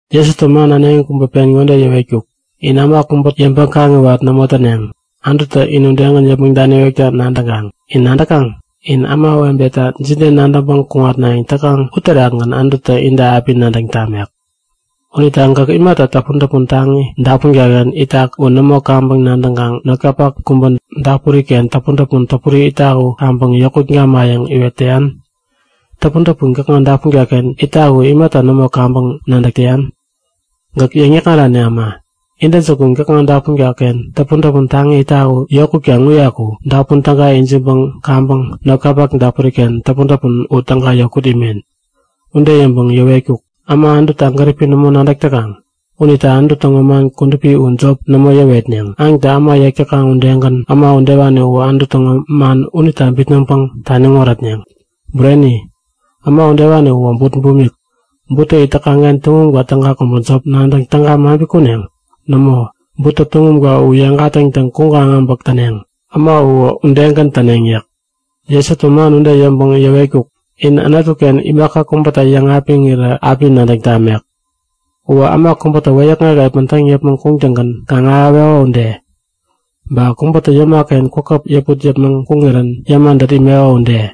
Jesutä man äneŋi kubä pen ŋode yäwetkuk; In äma kubä yäŋpäŋ-kaŋiwat nämo täneŋ, Anututä in udegän yäpmäŋ daniwekta nadäŋkaŋ. In nadäkaŋ? In ämawebeta jide nadäŋpäŋ kuŋatnayäŋ täkaŋ uterakgän Anututä inta api nadäŋ tamek. Unita gäk imata täpun-täpun taŋi dapunka-ken itak u nämo kaŋpäŋ nadäŋkaŋ notkapak kubä dapuri-ken täpun-täpun täpuri itak u kaŋpäŋ yokut gamayäŋ iwet täyan? Täpuntäpun gäkŋa dapunka-ken itak u imata nämo kaŋpäŋ nadäk täyan? Gäk yäŋ-yäkŋarani äma! Intäjukunä gäkŋa dapunka-ken täpun-täpun taŋi itak u yokutkaŋ uyaku dapun täga ijiŋpäŋ kaŋpäŋ notkapak dapuri-ken täpun-täpun u täga yokut imen! Ude yäŋpäŋ yäwetkuk; Äma Anututa gäripi nämo nadäk täkaŋ unita Anutu täŋo man kudupi u jop nämo yäwetneŋ. Aŋtä äma yek täkaŋ udegän äma udewani uwä Anutu täŋo man unita bitnäŋpäŋ taniŋ wärätneŋ. Bureni, äma udewani uwä but bumik. Buttä it täkaŋ-ken tuŋumka täga kubä jop nadäŋ täga maŋpi kuneŋ? Nämo, buttä tuŋumka u yeŋ gatäŋtäŋ kuŋkaŋ abäk täneŋ. Äma uwä udegän täneŋ yäk. Jesutä man ude yäŋpäŋ yäwetkuk; In Anutu-ken imaka kubäta yäŋapiŋirä api nadäŋ tamek. Uwä äma kubätä wäyäkŋek epän täŋ yäpmäŋ kuŋtäŋgän kaŋ-ahäweko ude. Ba kubätä yäma-ken kwäpkwäp yäput yäpmäŋ kuŋirän yäma dät imeko ude.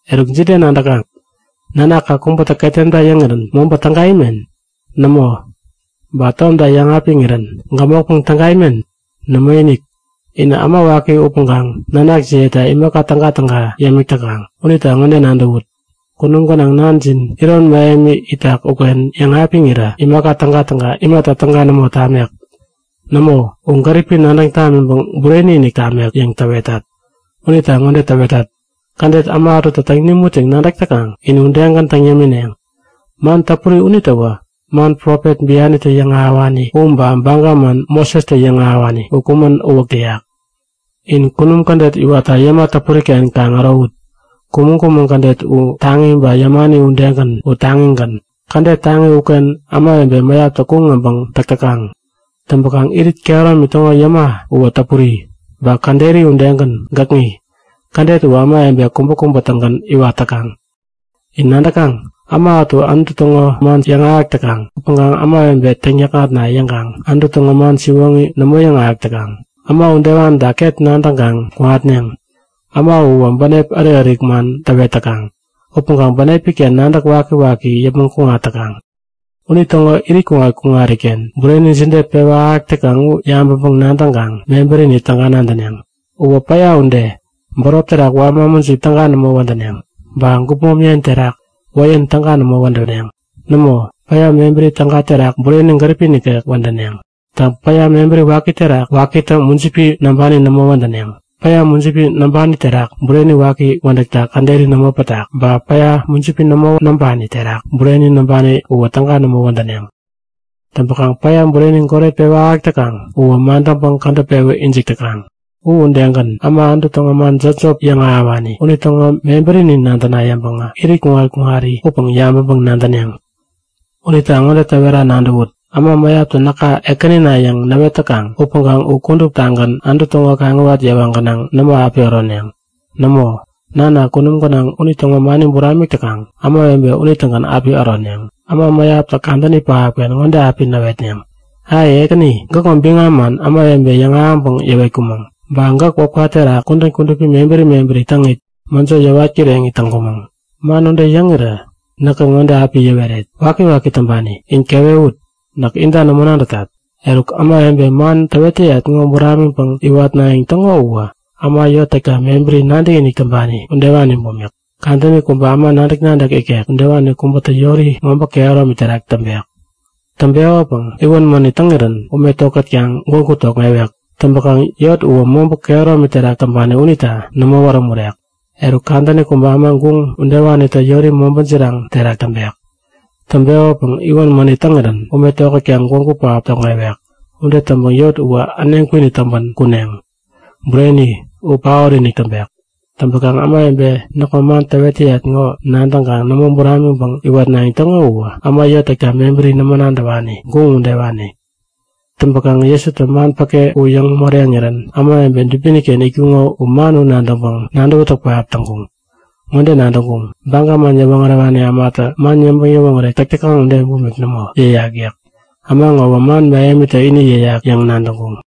Eruk, jide nadäkaŋ? Nanakka kubätä ketemta yäŋirän mobä täga imen? Nämo! Ba tomta yäŋapiŋirän gämokpäŋ täga imen? Nämoinik! Inä äma waki upäŋkaŋ nanakjiyeta imaka tägatäga yämik täkaŋ. Unita ŋode nadäwut; Kunum gänaŋ Nanjin iron mähemi itak uken yäŋapiŋirä imaka tägatäga imata täga nämo tamek? Nämo, u gäripi nadäŋ tamiŋpäŋ bureni-inik tamek yäŋ täwetat! Unita ŋode täwetat; Kädet äma ätutä täŋ nimut yäŋ nadäk täkaŋ in udegän täŋ yämineŋ. Man täpuri unitäwä man profet bianitä yäŋahäwani u ba baga man Mosestä yäŋahäwani u kumän uwäk täyak. In kunum kädet iwatta yäma täpuri-ken kaŋ ärowut. Kumäŋ-kumäŋ kädet u taŋi ba yämani udegän u taŋigän. Kädet taŋi uken ämawebe mäyaptä kuŋ äbäŋ täk täkaŋ. Täŋpäkaŋ irit kehäromi täŋo yäma uwä täpuri ba käderi udegän gäkŋi. Kädet uwä ämawebe kubäkubä-tägän iwat täkaŋ. In nadäkaŋ? Äma ätu Anutu täŋo man yäŋahäk täkaŋ upäŋkaŋ ämawebe täŋyäkŋatna yäŋkaŋ Anutu täŋo man siwoŋi nämo yäŋahäk täkaŋ. Äma udewanita ket nadäŋkaŋ kuŋatneŋ. Äma uwä bänep ärik-ärik man täwet täkaŋ upäŋkaŋ bänepi-ken nadäk wakiwaki yäpmäŋ kuŋat täkaŋ. Unitäŋo irit kuŋat-kuŋariken bureni jide pewä ahäk täkaŋ u yabäŋpäŋ-nadäŋkaŋ mebärini täga nadäneŋ. Uwä päya ude. Bärop terak wama mujip täga nämo wädäneŋ ba gupmom yen terak wäyän täga nämo wädäneŋ. Nämo, päya mebäri täga terak bureni gäripi nikek wädäneŋ. Täŋ, päya mebäri wakitä mujipi näŋpani nämo wädäneŋ. Päya mujipi näŋpani terak bureni waki wädäkta käderi nämo pätak. Ba päya mujipi nämo näŋpani terak bureni näŋpani uwä täga nämo wädäneŋ. Täŋpäkaŋ päya, bureni goret pewä ahäk täkaŋ uwä madäŋpäŋ kädäp pewä ijik täkaŋ. U udegän, äma Anutu täŋo man jopjop yäŋahäwani unitäŋo mebärini nadäna yäŋpäŋä irit kuŋat-kuŋari upäŋ yabäŋpäŋ-nadäneŋ. Unita ŋode täwera nadäwut; Äma mäyaptä näka Ekänina yäŋ näwet täkaŋ upäŋkaŋ u kuduptagän Anutu täŋo kaŋiwat yewa gänaŋ nämo api äroneŋ. Nämo! Nana kunum gänaŋ unitäŋo mani buramik täkaŋ ämawebe unitägän api äroneŋ. Äma mäyaptä kadäni pähapken ŋode api näwetneŋ; Ai! Ekäni! Gäkŋo biŋam man ämawebe yäŋahäŋpäŋ yäwetkumäŋ. Ba gäk wäpka terak kudän kudupi mebäri mebäri täŋit mäjo yäwat kireŋit täŋkumäŋ. Man ude yäŋirä näkä ŋode api yäweret; Wakiwaki täŋpani in kewewut! Näk inta nämo nadätat! Eruk, ämawebe man täwet täyat ŋo buramiŋpäŋ iwatnayäŋ täŋo uwä äma yot täkta mebäri nadäkinik täŋpani udewani bumik. Kadäni kubä äma nadäk-nadäk ikek udewani kubätä yori mobä kehäromi terak täŋpek. Täŋpekopäŋ iwän mänit täŋirän ume tokätkaŋ gwägu tokŋewek. Täŋpäkaŋ yot uwä mobä kehäromi terak täŋpani unita nämo wärämurek. Eruk kadäni kubä äma guŋ udewanitä yori mobä jiraŋ terak täŋpek. Täŋpekopäŋ iwän mänit täŋirän ume tokätkaŋ gwägu pähap tokŋewek. Ude täŋpäŋ yot uwä äneŋ kwinit täŋpän kuneŋ. Bureni, u paot-inik täŋpek! Täŋpäkaŋ ämawebe näkŋo man täwet täyat ŋo nadäŋkaŋ nämo buramiŋpäŋ iwatnayäŋ täŋo uwä äma yot täkta mebäri nämo nadäwani, guŋ udewani. Täŋpäkaŋ Jesutä man päke u yäŋ moreŋirän ämawebe dubini-ken itkuŋo u man u nadäŋpäŋ nadäwätäk pähap täŋkuŋ. Ŋode nadäŋkuŋ; Baga man yäwoŋärewani ämatä man yäŋpäŋ-yäwoŋärek täk täkaŋ ude bumik nämo yäyak yäk. Äma ŋowä man mähemitä ini yäyak yäŋ nadäŋkuŋ.